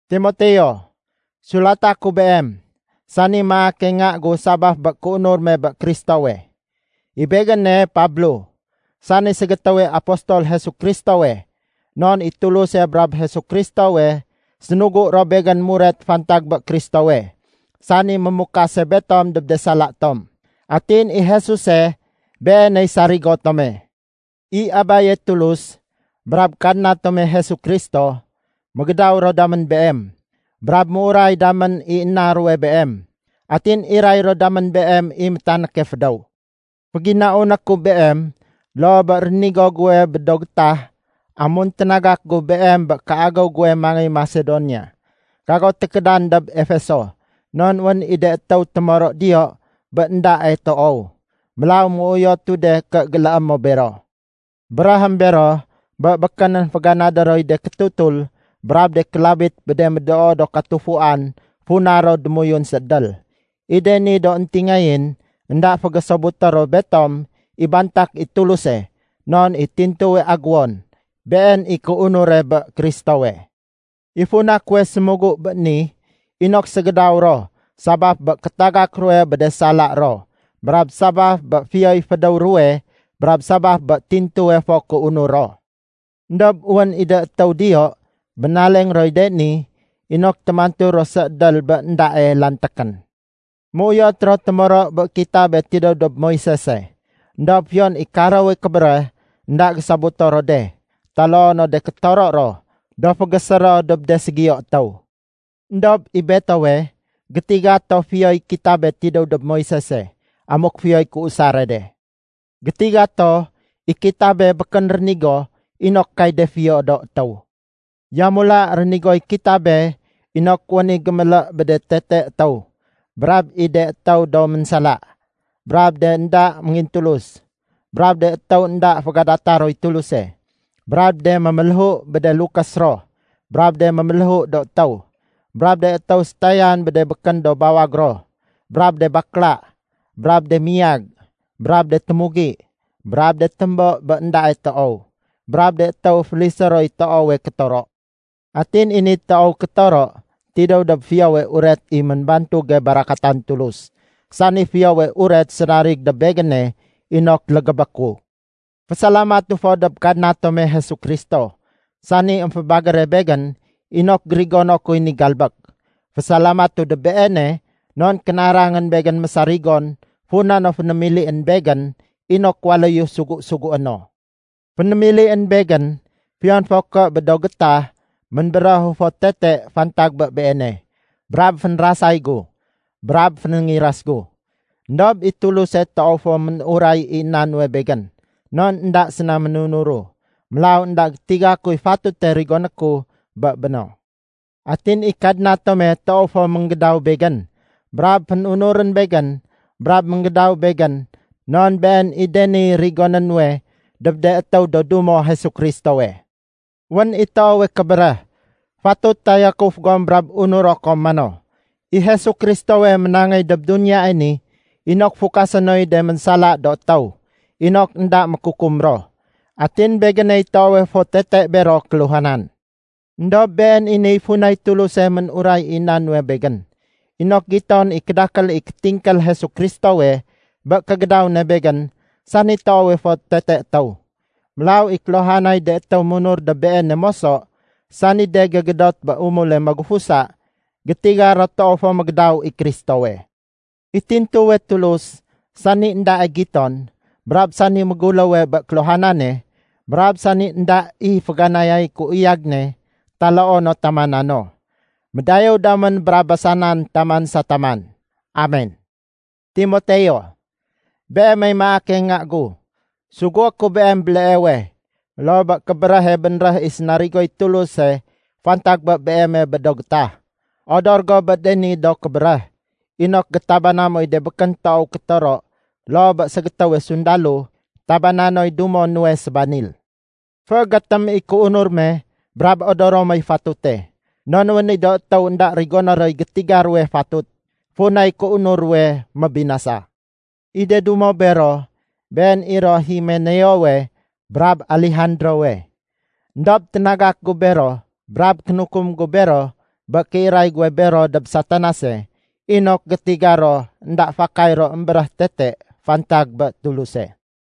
Timoteo, Sulata ku beem, sani maake nga gu sabaf bé kéunur me bé Kristowe. I begéne Pablo, sani ségétéwe apostol Jesu Kristowe non i Tuluse brab Jesu Kristowe sénugu ro begén muret fantag bé Kristowe, sani mémukase betom dob de sala tom. Atin i Jesuse, Beeney sarigo tome. I Abaye Tulus brab Kadna tome Jesu Kristo mégédaw ro damén beem, brab méuray damén i na ruwe beem, atin iray ro damén beem i métanéke fédéw. Féginauné ku beem loo bé rénigo guwe bé do gétah amun ténagak gu beem bé kéagéw guwe mangéy Masedonia. Kago tékédan dob Efeso, non wén i de étéw témoro diyo bé éndae toow. Mélaw méuyotu de ké géléé mo bero. Béréhém bero bé békénén féganadé roy de kétutul brab de kélabit bé de médoo do katufuan funa ro démoyun séédél. I de ni do éntingayén énda fégésobuté ro betom i bantak i Tuluse non i tintuwe aguwon, been i kéunure bé Kristowe. I funa kuwe sémugu bé ni inok ségédaw ro sabaf bé kétagak ruwe bé de sala ro brab sabaf bé fiyoy fédéw ruwe brab sabaf bé tintuwe fo kéunur ro. Endob wén i de étéw diyo bénaleng roy de ni inok témantu ro séédél bé éndae lantékén. Méuyot ro témoro bé kitabe tidéw dob Moisese. Endob fiyon i karowe kébéréh, énda gésobuto ro de taloo no de kétoro ro do fégésé ro dob de ségiyo étéw. Endob i betowe, gétiga to fiyoy kitabe tidéw dob Moisese amuk fiyoy kéusare de. Gétiga to, i kitabe békén rénigo inok kay de fiyo do étéw. Yamula rénigoy kitabe inok wén i gémélé bé de tete étéw, brab i de étéw do ménsala, brab de énda méngintulus, brab de étéw énda fégadata roy Tuluse, brab de méméléhu bé de lukés ro brab de méméléhu do étéw, brab de étéw sétayan bé de békén do bawag ro, brab de bakla, brab de miyag, brab de témugi, brab de témbo bé éndae toow, brab de étéw félisé roy toowe kétoro. Atin i ni toow kétoro, tidéw dob Fiyowe Uret i ménbantuge barakatan Tulus, sani Fiyowe Uret sénarig dob begéne inok légébé ku. Fésalamatu fo dob Kadna tome Jesu Kristo, sani émfébagére begén inok gérigono kuy ni galbék. Fésalamatu dob Beene non kénarangén begén mésarigon funa no fénémilién begén inok waléyu sugu-sugué no. Fénémilién begén fiyon fo ké bé do gétah ménbéréhu fo tete fantag bé Beene, brab fénrasay gu, brab fénéngiras gu. Endob i Tuluse toow fo ménuray i na nuwe begén non énda séna ménunuru, mélaw énda gétiga kuy fatute rigoné ku bé béno. Atin i Kadna tome toow fo ménggédaw begén brab fénunurén begén brab ménggédaw begén non been i de niy rigoné nuwe dob de étéw do dumo Jesu Kristowe. Wén i toowe kébéréh, fatut tayakuf gom brab unuro kom mano, “I Jesu Kristowe ménangéy dob duniyae ni inok fukasé noy de ménsala do étéw inok énda mékukum ro.” Atin begéney toowe fo tete bero kéluhanan. Endob been i niy funay Tuluse ménuray i na nuwe begén, inok giton i kédakél i kétingkél Jesu Kristowe bé kégédaw ne begén sani toowe fo tete étéw. Mélaw i kéluhanay de étéw munur dob Beene moso, sani de gégédot bé umule magufusa, gétiga ro toow fo mégédaw i Kristowe. I tintuwe Tulus, sani éndae giton, brab sani méguléwe bé kéluhanane, brab sani énda i féganayay kéuyag ne taloo no tamana no, médayéw damén brab basanan taman sa taman. Amen! Timoteo, beemey maake nga gu, sugué ku beem béleewe, loo bé kébéréhe bénréh i sénarigoy Tuluse fantag bé beeme bé do gétah. Odor go bé de ni do kébéréh inok gétabana moy de békén toow kétoro loo bé ségétéwe sundalo tabana noy dumo nuwe sébanil. Féégétém i kéunur me brab odoro moy fatute. Non wén i do étéw énda rigoné roy gétiga ruwe fatut, funay kéunur ruwe mébinasa. I de dumo bero, been i ro Himeneowe brab Alejandrowe. Endob ténagak gu bero brab kénukum gu bero bé kéiray guwe bero dob Satanase inok gétiga ro énda fakay ro émbéréh tete fantag bé Tuluse.